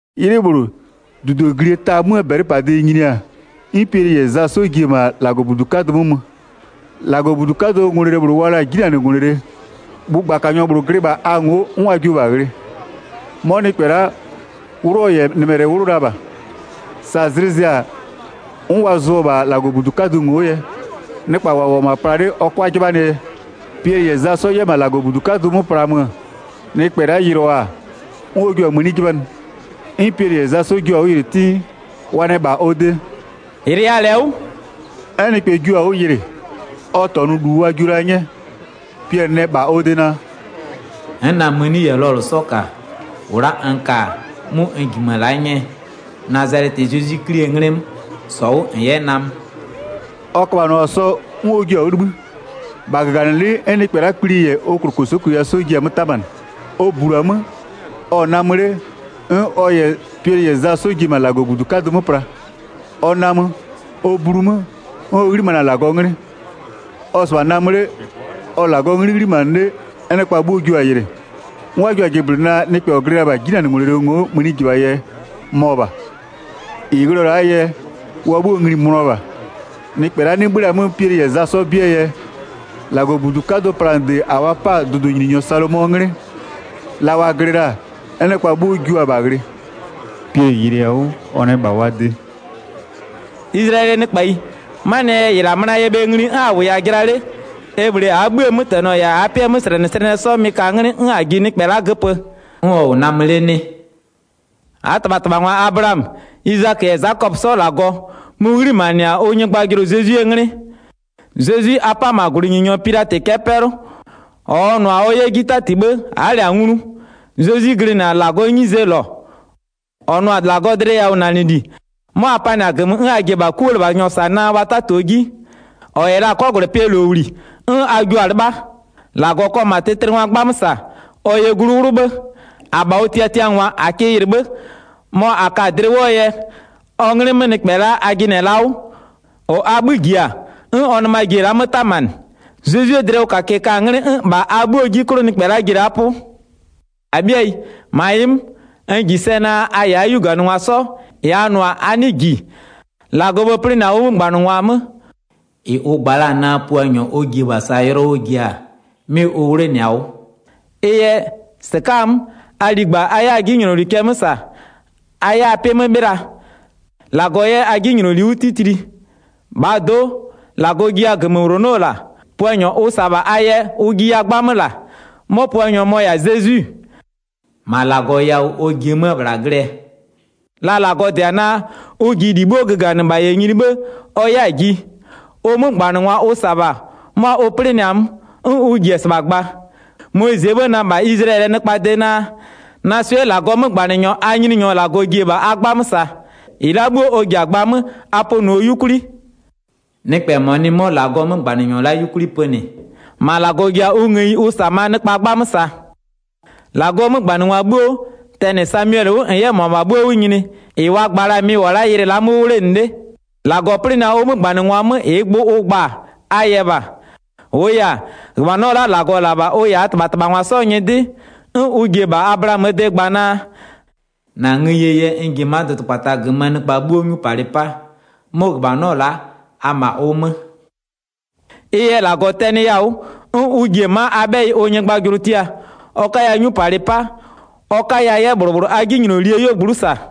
'Ylɩ -bhlʋ, -dudoglie ta 'möö -bɛlɩpade nyini-a, 'n Piɛlɩ -yɛ Za 'sɔ ji-e -ma -Lagɔbudu 'kadʋ 'mö mö. 2-Lagɔbudu 'kadʋɔ ngwlele -bhlʋ wa la-a 'jinanɩngwlele, bhʋgbakanyɔ -bhlʋ glɩ -bha a ngo'o 'n wa jio-o -bha ghlɩ. 'Mɔ nɩkpɛ la'a, 'wlʋ ɔ -yɛ ɔ nɩmɛlɛ 'wlʋ la -bha. Sa zlɩ zɩ-a 'n wa zʋɔ-ɔ -bha -Lagɔbudu 'kadʋ ngo'o yɛ, nɩkpa -wa -wʋ-ɔ -ma pla 'le ɔ 'kʋa 'jɩbhanɩɛ yɛ. Piɛlɩ -yɛ Za 'sɔ 'yɛ -ma -Lagɔbudu 'kadʋ 'mö plaa mö, nɩkpɛ la'a yɩlʋa-a, 'n ɔ jua-a mëni 'jɩbhanɩ. 'N Piɛlɩ -yɛ Za 'sɔ jio-a 'wʋ yɩlɩ 'tɩ. Wa nɛ -bha ɔ de: “-Yɩlɩya -lɛ 'wʋ.” 'N nɩkpɛ jua-a 'wʋ yɩlɩ, ɔ -tɔnʋ -lu wa jio la 'nyɛɛ. Piɛlɩ nɛ -bha ɔ de naa: “N'n na-a mëni -yɛ lɔlʋ 'sɔ -ka. -Ʋ la'a n ka-a 'mʋ n -jimö-ö la'a 'nyɛɛ. Nazalɛtɩɛ Zezwi 'Klie 'nglɩ 'mö, -sɔ 'wʋ -n 'yɛ namö.” Ɔ köbhanɩɔ-a sɔ 'n ɔ jio-a 'wʋ 'libhï. -Bha -gaganɩlɩ'ɩ 'n nɩkpɛ la'aa kpli -yɛ ɔ -klokosokoyia 'sɔ ji-a 'mö 'tamanɩ. Ɔ -blu-a 'mö, ɔ-ɔ namö 'le, 'n ɔ -yɛ Piɛlɩ -yɛ Za 'sɔ ji-e -ma -Lagɔbudu 'kadʋ 'mö pla. Ɔ namö, ɔ blu 'mö, 'n ɔ 'ghlimanɩ-a -Lagɔɔ 'nglɩ. Ɔ-ɔ 'sɩbha namö 'le, ɔ-ɔ -Lagɔɔ 'nglɩ 'ghlimanɩ 'le, 'n nɩkpa 'bhuo jio-a yɩlɩ. 'N wa jio-a jɩblɩnɩ naa, nɩkpɛ -ɔ glɩ la-a -bha 'jinanɩngwlele ngo'o mënijɩbha yɛ, mɔ -bha. -Ɩ ghlɩɔ-ɔ la'aa yɛ, wa 'bhuo ngli-i mönʋa -bha. Nɩkpɛ la'a 'nɩ 'bhö-ö la-a 'mö Piɛlɩ -yɛ Za 'sɔ 'bɩɛ yɛ, -Lagɔbudu 'kadʋɔ planɩde -a wa 'pa-a dʋdʋnyininyɔ Salomɔɔ 'nglɩ, la wa glɩ la-a, 'n nɩkpa 'bhuo jua-a -bha ghlɩ. Piɛlɩ yɩlɩɩ-a 'wʋ, ɔ nɛ -bha wa de: “Izlayɛlɩɛ nɩkpayi, 'manɩɛ yɛ -ɩ -la mönaya bhe ngli 'n a -wʋya-a jɩla 'le, e -bhlee -aa 'bhïë 'mötɛnɔ -yɛ -aa 'pɩɛ 'möslɛnɩslɛnɩɛ 'sɔ mɩ-ɩ ka 'nglɩ 'n -a ji nɩkpɛ la'a göpö, 'n ɔ -wʋ namö 'le 'nɩ? 13-Aa -tɩbhatɩbhangwa Ablaamö, Izakö -yɛ Zakɔpö 'sɔɔ -Lagɔ, mʋ-ʋ 'ghlimanɩ-a ʋ nyɩgbajʋlʋ Zezwie 'nglɩ. Zezwi a 'pa-a -ma -gwlɩnyininyɔ Pilatɩ cɛ'ɛ 'pɛlʋ, -ɔ ɔ nʋ-a ɔ 'yɛ 'ji 'tati 'bhë a'a -lɛ-a nglu. Zezwi-i glɩnɩ-a -Lagɔɔ 'nyizee -lɔ, -ɔ nʋ-a -Lagɔɔ dlɩyawʋnanɩli, 'mɔ a panɩ-a -gömö 'n a ji-e -bha 'kulɩbhanyɔ -sa naa wa 'tatio 'ji. 15-Ɔ -yɛ la-a 'kɔgwlɛpɩɛ -lowli, 'n a jio-a 'lɩbha. -Lagɔ kɔ -ma tlɩtlɩngwaa 'gbamö -sa, ɔ yɛ glu 'wlʋ 'bhë. -Abha ɔ tiatiangwa -a kɩ yɩlɩ 'bhë. Mɔ -a ka-a dlɩ 'wʋɔ yɛ, ɔ 'nglɩ 'mö nɩkpɛ a jɩnɩ-ɛ la'a 'wʋ, -ɔ a 'bhï -ji-a, 'n ɔ nɩma ji-e la'a 'mö 'tamanɩ. Zezwie dlɩwʋkakɩɛ-ɛ ka-a 'nglɩ 'n -bha a 'bhuoo 'ji 'klʋ nɩkpɛ la'a ji-e -la 'pʋ. 17-Abhɩayi, -ma ɩ 'mö, n -ji sɛ naa a -yɛ a 'yuganɩngwa 'sɔ, -ɩ a nʋ-a a 'nɩɩ -ji. 18-Lagɔɔ 'bhë 'plɩnɩ-a ʋ 'mögbanɩngwa 'mö, -ɩ ʋ gba la-a naa Puanyɔ ʋ ji-e -bha -saa yʋlɔ ɔ ji-a, 'mɩ ʋ 'wlenɩ-a 'wʋ. Ɩ yɛ, -sɩka'a-a 'mö, a ligba a 'yɛ a 'jinyloli cɛ 'mö -sa a 'yɛ a 'pɩ 'mö 'bhɩla, -Lagɔ 'yɛ a 'jinyloli 'wʋ 'titli. 20-Bhaa do'o, -Lagɔ jiya -gömöwlonɔ -la. Puanyɔ ʋ -sa-a -bha a yɛ ʋ jiya 'gbamö -la. 'Mɔ Puanyɔ mɔ-ɔ -yɛ-a Zezwi. 21-Ma -Lagɔ yawʋ ɔ ji-e 'mö-ö -bhla glɩɛ, la -Lagɔ -dɩ-a naa, ʋ ji -li 'bhuo göganɩ -bha -yɛ nyini 'bhë ɔ 'yɛ-a ji. Ʋ 'mögbanɩngwa ʋ -sa-a -bha 'mʋa ʋ 'plɩnɩ-a 'mö, 'n ʋ ji-e -sɩbha gba. Moyizɩɛ 'bhë nɛ -bha Izlayɛlɩɛ nɩkpaa de naa: Na swɩ'ɩɛ -Lagɔɔ 'mögbanɩnyɔ a Nyininyɔ -Lagɔ ji-e -bha a 'gbamö -sa-a. -Ɩ la'a 'bhuo ɔ ji-a gbaa 'mö, a pönɩɔ 'yukwli. Nɩkpɛ -mɔ nɩ 'mɔ -Lagɔɔ 'mögbanɩnyɔ la'a 'yukwli pönɩ, -ma -Lagɔ jio-a ngëyi ʋ -sa-a -bha 'möö nɩkpa 'gbamö -saa. 24-Lagɔɔ 'mögbanɩngwa 'bhuo, tɛnɩ Samiɛlɩ 'wʋ -n 'yɛ -mʋabha 'bhuo 'wʋ nyini-e, -ɩ wa gba la-a mɩ-ɩ -wʋ-ɔ la'a ylɩ la'a 'mö 'wʋ 'wlenɩ 'le. 25-Lagɔ 'plɩnɩ-a ʋ 'mögbanɩngwa 'mö -ɩɩ gbʋ ʋ gba-a, a yɛ -bha. -Wʋʋ yɛ-a, -ghöbhanɔ la'a -Lagɔ -la-a -bha ʋ -yɛ -aa -tɩbhatɩbhangwa 'sɔɔ nyɩdɩ, 'n ʋ ji-e -bha Ablaamöö de gba naa: -Na ngëyie yɛ n ji-e ma'a dʋdʋkpata -gömöö nɩkpa 'bhuo 'nyupalɩ 'paa, 'mʋ -ghöbhanɔ la'a a-a -ma ʋ 'mö. Ɩ yɛ -Lagɔ tɛnɩya-a 'wʋ, 'n ʋ ji-e ma'a a 'bhɛyɩ ʋ nyɩgbajʋlʋ tia, ɔ 'kaya 'nyupalɩ 'pa, ɔ 'kaya 'yɛ -bhlʋ -bhlʋ a 'jinylolie 'yuogblʋ'ʋ -sa.”